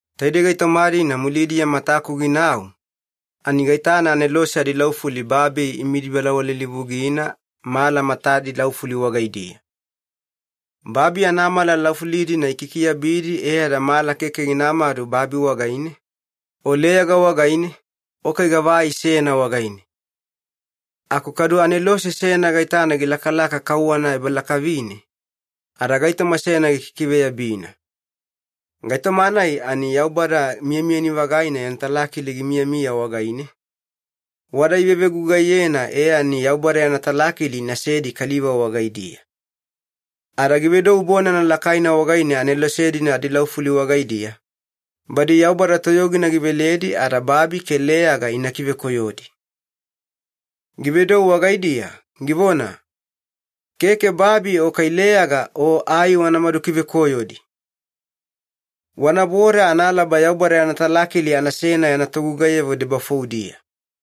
Taidei gaitoma-dina mulidiya mataku ginau, ani gaitana anelose adilaufuli babi imidi balawalilivugina mala matadi laufuli wagaidiya. Babi anamala laufuli-dina ikikiabidi e ada mala keke ginamadu babi wagaine, o leyaga wagaine, o kai gava ai seyana wagaine. Aku kadu anelose seyana gaitana gilakalaka kauwana ebalakavine, ada gaitoma seyana gikikiveyabina. Gaitoma-nai ani Yaubada miyamiyani-vagaina yana talakili gimiyamiya wagaine, wada ivevegugaiyena e ani Yaubada yana talakili inasedi kaliva wagaidiya. Ada givedou bonana lakaina wagaine anelose-dina adilaufuli wagaidiya, badi Yaubada toyogina giveledi ada babi ke leyaga ina kivekoyodi. Givedou wagaidiya, givona, “Keke babi o kai leyaga o ai wanamadu kivekoyodi. Wanaboda analaba Yaubada yana talakili anasena yana togugaiyavo debafoudiya.”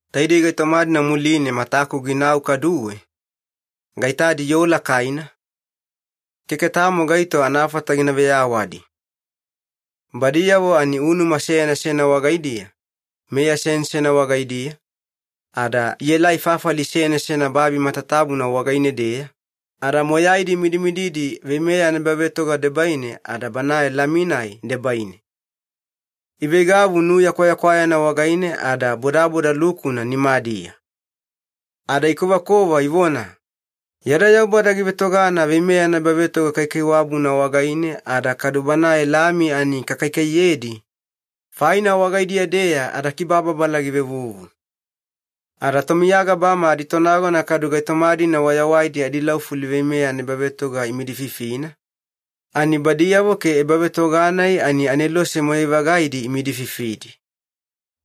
Taidei gaitoma-dina muline mataku ginau kaduwe, gaitadi yoo lakaina, keke tamo gaito anafata gina veyawadi. Badiyavo ani unuma seyana seyana wagaidiya, meya seyana seyana wagaidiya, ada ielai fafali seyana seyana babi matatabuna wagaine-deya, ada moyaidi imidimididi veimeya anaebavetoga debaine ada Banae Lami-nai debaine. Iveigavu nuya kwayakwayana wagaine ada bodaboda lukuna nimadiya. Ada ikovakova ivona, “Yada Yaubada givetogana veimeya anaebavetoga kaikaiwabuna wagaine ada kadu Banae Lami ani kakaikaiyedi, faina wagaidiya-deya adakibababala givevuvu.” Ada tomiya gabama aditonagona kadu gaitoma-dina wayawaidi adilaufuli veimeya anaebavetoga imidififina, ani badiyavo ke ebavetoga-nai ani anelose moyai-vagaidi imidififidi.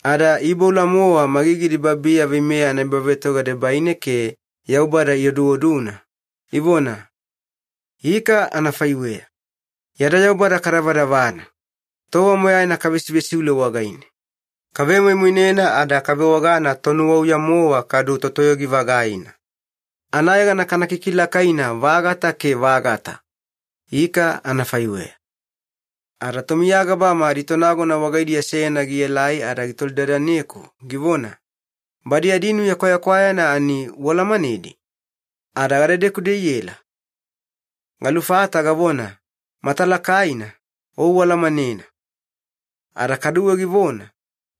Ada iiboula-mowa magigidi babiya veimeya anaebavetoga debaine ke Yaubada ioduoduna, ivona, “Ika anafaiweya! Yada Yaubada kadavadavana! Tova moyaina kavesivesiule wagaine. Kavemoimoinena ada kavewagana Tonuwauya-mowa kadu Totoyogi-vagaina. Anayegana kana kikilakaina-vagata ke vagata! Ika anafaiweya.” Ada tomiya gabama aditonagona wagaidiya seyana gielai ada gitolidadaneku givona, “Badi adinuya kwayakwayana ani ualamanedi? Ada gadedeku-deya iela?” Galufata gavona, “Matalakaina, o ualamanena.” Ada kaduwe givona,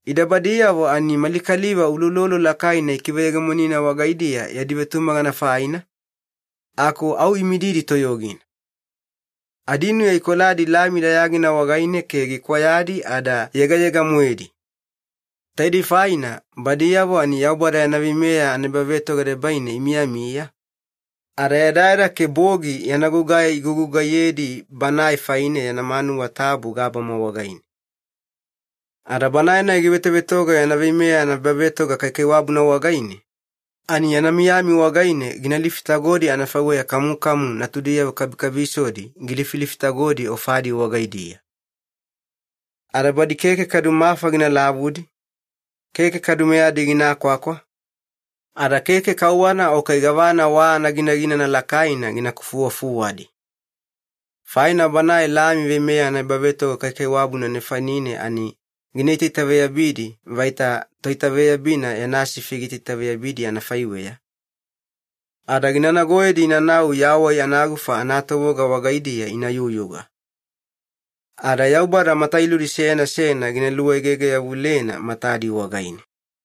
“Ida badiyavo ani mali kaliva uloulolo lakaina ikiveyegemonina wagaidiya yadi vetumagana faina, aku au imididi toyogina. Adinuya ikoladi Lami dayagina wagaine ke gikwayadi ada yegayega-moedi. Taidei faina badiyavo ani Yaubada yana veimeya anaebavetoga debaine imiyamiya, ada yadayada ke bogi yana gugai igugugaiyedi Banae faine yana manuwa tabu gabama wagaine. Ada Banae-nai givetovetoga yana veimeya anaebavetoga kaikaiwabuna wagaine, ani yana miyami wagaine gina lifitagodi anafaiweya kamukamu natudiyavo kabikabisodi gilifilifitagodi ofadi wagaidiya. Ada badi keke kadu mafa gina lavudi, keke kadu meyadi gina kwakwa, ada keke kauwana o kai gavana wa anaginaginana lakaina gina kufuwafuwadi. Faina Banae Lami veimeya anaebavetoga kaikaiwabuna nefanine ani gina itaitaveyabidi vaita toitaveyabina yana sifi giitaitaveyabidi anafaiweya, ada gina nagoyedi inanau yawai anagufa anatovoga wagaidiya ina yuyuga. Ada Yaubada matailudi seyana seyana gina luegege-yavulena matadi wagaine.”